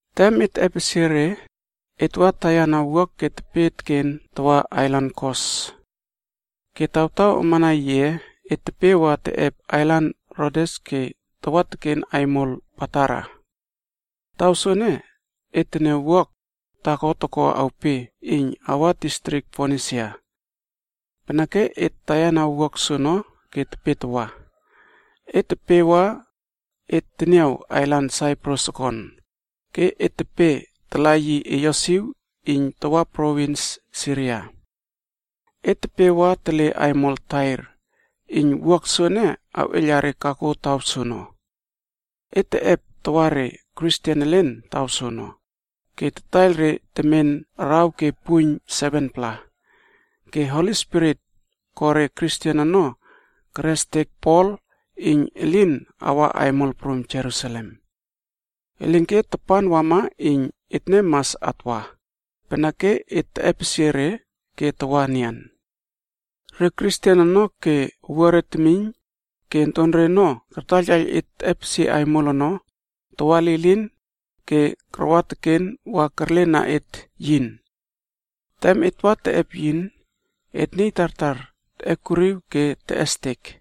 Tem et teꞌepesie re, et wa taiyana wuak ke tepe teken tawa ailan Kos. Ke tawtaw amana yiꞌe, et tepe wa teꞌep ailan Rodes ke tawa teken aimol Patara. Taw soene, et teniaw wuak aimol taako toko awpe iyn awa distrik Fonisia. Peneke et taiyana wuak aimol soono ke tepe tawa. Et tepe wa et teniaw ailan Saiprus okon, ke et tepe tala yi eyosiw iyn tawa provins Siria. Et tepe wa tele aimol Tair, iyn wuak aimol ene awꞌeiyla re o elen taw soono. Et teꞌep tawa re Kristen elen taw soono, ke tataiyl re temen araw ke puiyn 7-pla. Ke Holi Spirit ko re Kristen ono, kerestek Pol iyn yi lin awa aimol prum Jerusalem. Elinke tapan wama iyn etne mas atwa, peneke et teꞌepesie re ke tawa enian. Re Kristen ono ke owuare temiyn ke ontore ono kartaiyltaiyl et teꞌepesie aimol ono tawa lilin ke karwa teken wa kerlena et yin. Tem et wa teꞌep yin, et niy tartar teꞌekuriw ke teꞌestek.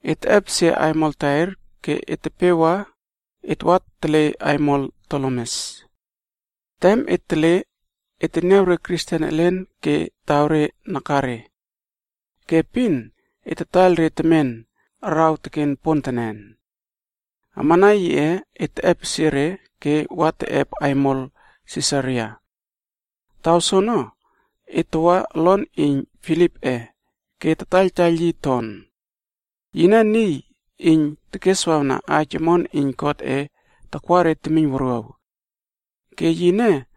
Et teꞌepesie aimol Tair ke tepe wa, et wa tele aimol Tolemes. Tem et tele, et teniaw re Kristen elen ke taw re nakare. Ke epin et tataiyl re temen araw teken pontenen. Amana yiꞌe, et teꞌepesie re ke wa teꞌep aimol Sisaria. Taw soono et tawa olon iyn Filipꞌe ke tataiyltaiyl yi ton. Yine niy iyn tekeswawna aij omon iyn Godꞌe takwa re temiyn wuruaw. Ke yine,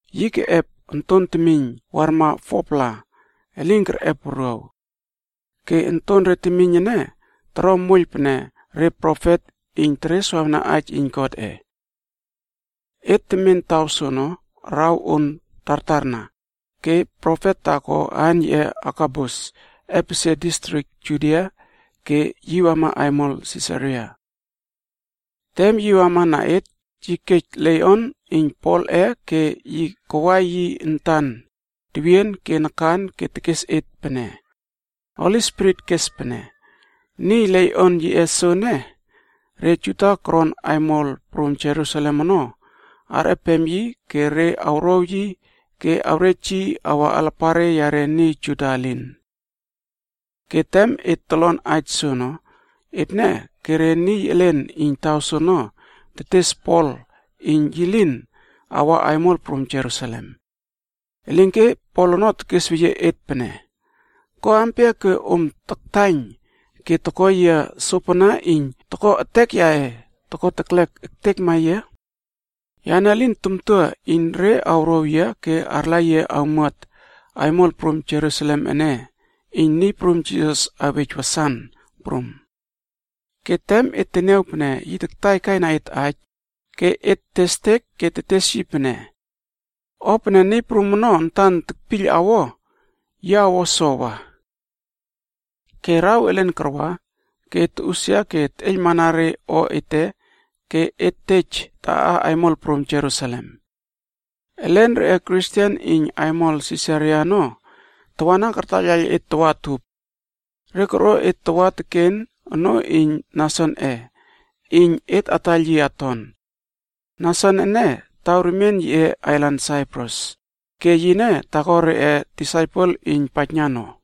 Yi keꞌep onton temiyn warma 4-pla elin kerꞌep wuruaw. Ke ontonre temiyn ene toro moiyl pene re profet iyn tereswawna aij iyn Godꞌe. Et temen taw soono araw on tartarna, ke profet taako aan yiꞌe Agabus epesie distrik Judia ke wama aimol Sisaria. Tem yi wamana et, yi kej leiꞌon iyn Polꞌe ke yi kawai yi antan tewien ke nakan ke tekes et pene, “Holi Spirit kes pene: ‘Niy leiꞌon yiꞌe soene, re Juda koron aimol prum Jerusalem ono arꞌepem yi ke re awrow yi ke awrej yi awa alapare yare niy Juda elin.’” Ke tem et tolon aij soono, etne ke re niy elen iyn taw soono tes empema Pol ono iyn yi lin awa aimol prum Jerusalem. Elinke Pol ono tekesweyie et pene, “Ko ampia ke om taktaiyn ke toko yia sopana iyn toko etek yaꞌe toko teklek ektekma yia? Yane lin tamtua iyn re awrow yia ke arla yia awmuat aimol prum Jerusalem ene iyn Niy Prum Jisas awej wasan prum.” Ke tem et teniaw pene yi taktaikaina et aij, ke et testek ke tetes yi pene, “O pene Niy Prum ono antan tekpiyl awo, yi awo sowa.” Ke araw elen karwa, ke et toꞌusia ke et teꞌeiylmana re o ete ke et tej taꞌa aimol prum Jerusalem. Elen reꞌe Kristen iyn aimol Sisaria ono tawana kartaiyl et tawa utup. Re korꞌo et tawa teken onoo iyn Nasonꞌe iyn et ataiyl yi aton. Nason ene taw remien yiꞌe ailan Saiprus, ke yine taako reꞌe disaipel iyn paijna no.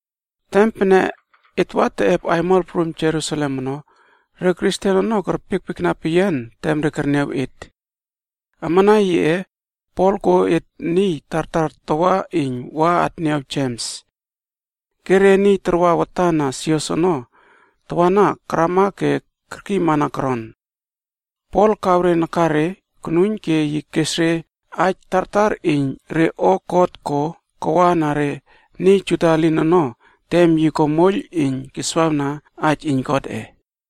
Tem pene et wa teꞌep aimol prum Jerusalem ono, re Kristen ono kerpiekpiekna peyian tem re kerniaw et. Amana yiꞌe, Pol koꞌo et niy tartar tawa iyn wa atniaw Jems. Ke re niy tarwa watan na sios ono tawana karama ke kerkiymana koron. Pol kaw re nakare konuiyn ke yi kes re aij tartar iyn re o God ko kawana re niy Juda elin ono tem yi ko moiyl iyn keswawna aij iyn Godꞌe.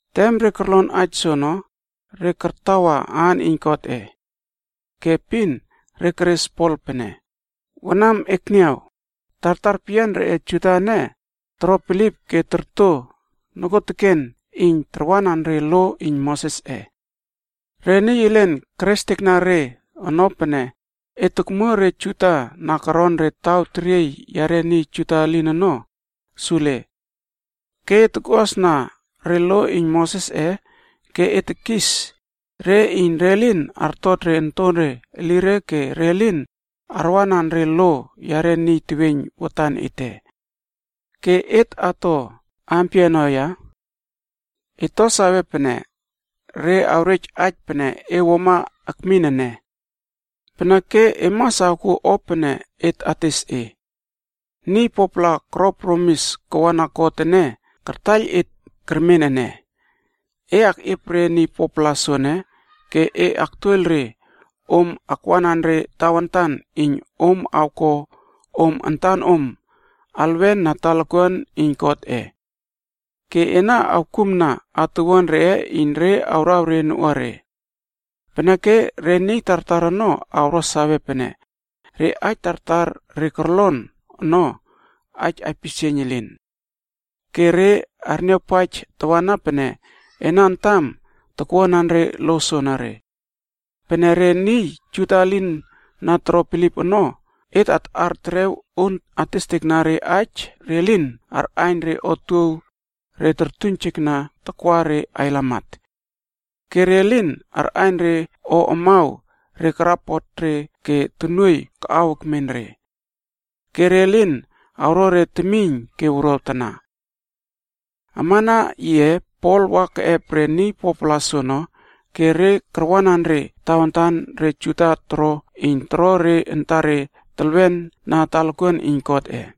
Tem re korlon aij soono, re kartawa aan iyn Godꞌe. Ke epin re keres Pol pene, “Wanam ekniaw, tartar peyian reꞌe Juda ene toro bilip ke torto nokuoteken iyn tarwanan re lo iyn Mosesꞌe. Re niy elen kerestekna re ono pene e tokmuo re Juda na koron re taw teriey yare niy Juda elin ono sule. Ke e tokꞌuasna re lo iyn Mosesꞌe ke e tekis re iyn re lin artot re ontore elire ke re lin arwanan re o yare niy teweiyn watan ete. Ke et ato ampia ono ya? Et to sawe pene re awrej aij pene e wuama akmin ene. Peneke e mas awkuo o pene et ates e. Niy 4-pla koro promis kawana God ene kartaiyl et kermen ene. E akꞌiep re niy 4-pla soene ke e aktuoiyl re om akwanan re tawantan iyn om awko om antanom alwen na talakuan iyn Godꞌe. Ke ena awkumna atuwuan reꞌe iyn re awraw re noꞌuare. Peneke re niy tartar ono awro sawe pene re aij tartar re korlon ono, aij aipisieiyn elin. Ke re arniawpaij tawana pene ena antam takwuanan re lo soenere. Pene re niy Juda elin na toro bilip ono, et taꞌar terew on testekna re iyn re lin arꞌaiyn re otuow re tortuiynjekna takwa re ailamat. Ke re lin arꞌaiyn re o amaw re keryiypot re ke tonuoiy kaꞌaw ekmen re. Ke re lin awro re temiyn ke wuruaw tana.” Amana yiꞌe Pol wa keꞌep re niy 4-pla soono ke re karwanan re tawantan re Juda toro iyn toro re antare telwena talakuan iyn Godꞌe.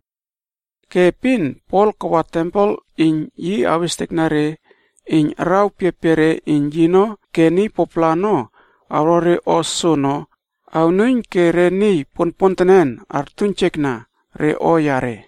Ke epin Pol kawa tempel iyn yi awestekna re iyn araw piapiare iyn yino ke niy 4-pla ono awro o soono awnuiyn ke re niy ponpontenen artuiynjekna re o yare.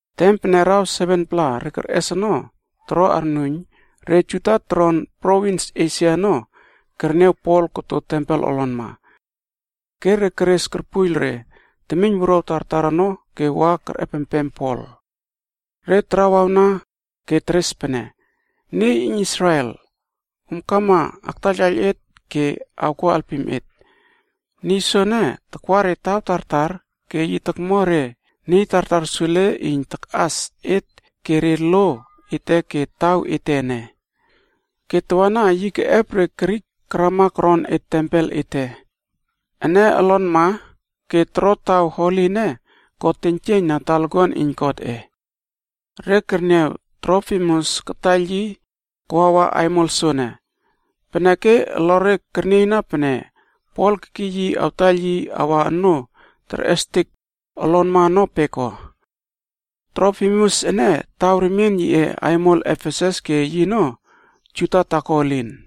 Tem pene araw 7-pla re kerꞌes ono toro arnuiyn, re Juda toron provins Esia ono kerniaw Pol koto tempel olonma. Ke re keres korpuiyl re temiyn wuruaw tartar ono ke wa kerꞌepempem Pol. Re tarawawna ke teres pene, “Niy iyn Israel, om kama aktaiyltaiyl et ke awko alpim et. Niy soene takwa re taw tartar ke yi tokmo re niy tartar sule iyn takꞌas et ke re lo ete ke taw ete ene. Ke tawana yi keꞌep re Grik karama koron et tempel ete ene olonma ke toro taw Holi ene ko teiynjieiyn na talakuan iyn Godꞌe.” Re kerniaw Trofimus kataiyl yi kawawa aimol soene, peneke olore kernieyna pene Pol kekiy yi awtaiyl yi awa onoo terꞌestek olonma ono peko. Trofimus ene taw remien yiꞌe aimol Efesus ke yino Juda taako elin.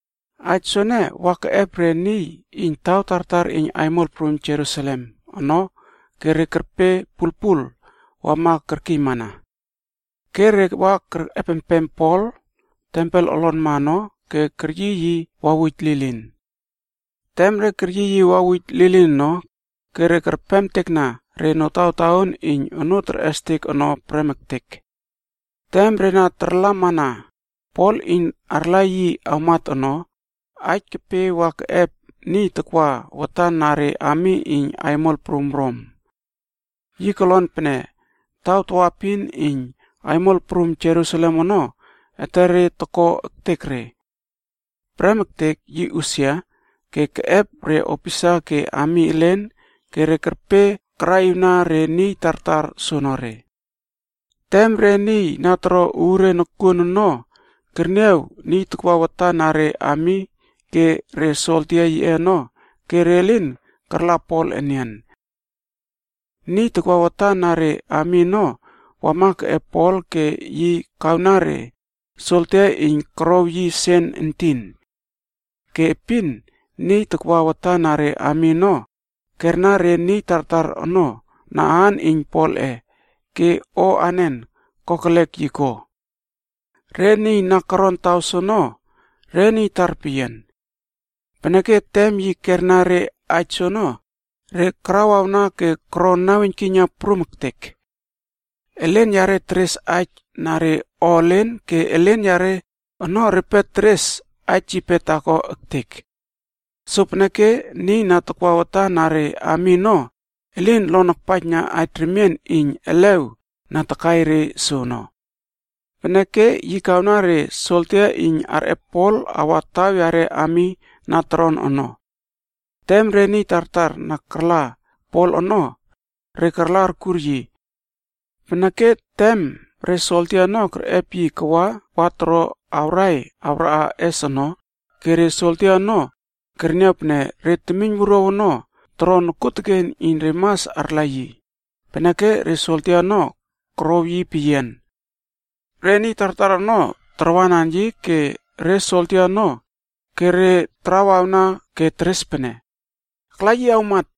Aij soene wa keꞌep re niy iyn taw tartar iyn aimol prum Jerusalem ono ke re kerpe pulpul wama kerkiymana. Ke re wa kerꞌepempem Pol tempel olonma ono ke keryiy yi wawuj lilin. Tem re keryiy yi wawuj lilin ono, ke re kerpemtekna re notawtaon iyn onoo terꞌestek ono prem ektek. Tem re na tarlamana Pol iyn arla yi awmat ono, aij kepe wa keꞌep niy takwa watan na re ami iyn aimol prum Rom. Yi kolon pene taw tawaepin iyn aimol prum Jerusalem ono etere toko ektek re. Prem ektek yi usia ke keꞌep re opisa ke ami elen ke re kerpe karaꞌiwna re niy tartar soonore. Tem re niy na toro uure nokuon ono kerniaw niy na takwa watan na re ami ke re soldia yiꞌe ono, ke re lin karla Pol enian. Niy takwa watan na re ami ono wama keꞌep Pol ke yi kawna re soldia iyn korow yi sen entin. Ke epin, niy na takwa watan na re ami ono kerna re niy tartar ono na aan iyn Polꞌe ke o anen kokelek yi ko. Re niy na koron taw soono, re niy tarpeyian. Peneke tem yi kerna re aij soono, re karawawna ke koro naweiynkiyna prum ektek. Elen yare teres aij na re o elen ke elen yare ono repe teres aij yipe taako ektek. Sopeneke niy na takwa watan na re ami ono elin lon akpaijna aij remien iyn elew na takai re soono. Peneke yi kawna re soldia iyn arꞌep Pol awa taw yare ami na toron ono. Tem re niy tartar na karla Pol ono, re karla arkur yi. Peneke tem re soldia ono kerꞌep yi kawa wa toro awrai awraꞌa ess ono ke re soldia ono kerniaw pene re temiynwuruaw ono toro nokuoteken iyn re mas arla yi, peneke re soldia ono korouw yi peyian. Re niy tartar ono tarwanan yi ke re soldia ono, ke re tarawawna ke teres pene, “Akla yi awmat.”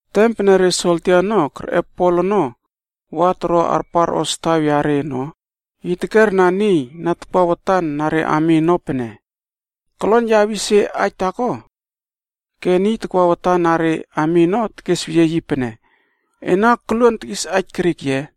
Tem pene re soldia ono kerꞌep Pol ono wa toro arparꞌos taw yare ono, yi tekerna niy na takwa watan na re ami ono pene, “Kolon ya awis e aij taako?” Ke niy takwa watan na re ami ono tekesweyie yi pene, “Ena koluon tekis aij Grik ye?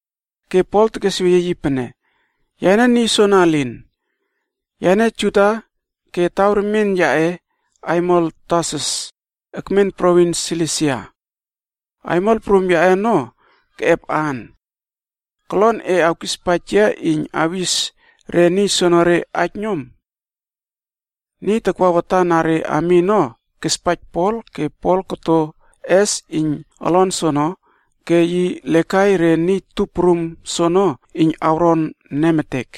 Ke Pol tekesweyie yi pene, “Yane niy soana elin. Yane Juda ke taw remien yaꞌe aimol Tarsus ekmen provins Silisia. Aimol prum yaꞌe ono keꞌep aan. Kolon e awkispaij yia iyn awis re niy soonore aij nom.” Niy takwa watan na re ami ono kespaij Pol ke yi koto ess iyn olon soono ke yi lekai re niy tup prum soono iyn awron nemetek.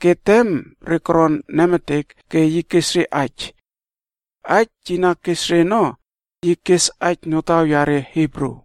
Ke tem re koron nemetek ke yi kes re aij. Aij yi na kes re ono, yi kes aij notaw yare Hibru.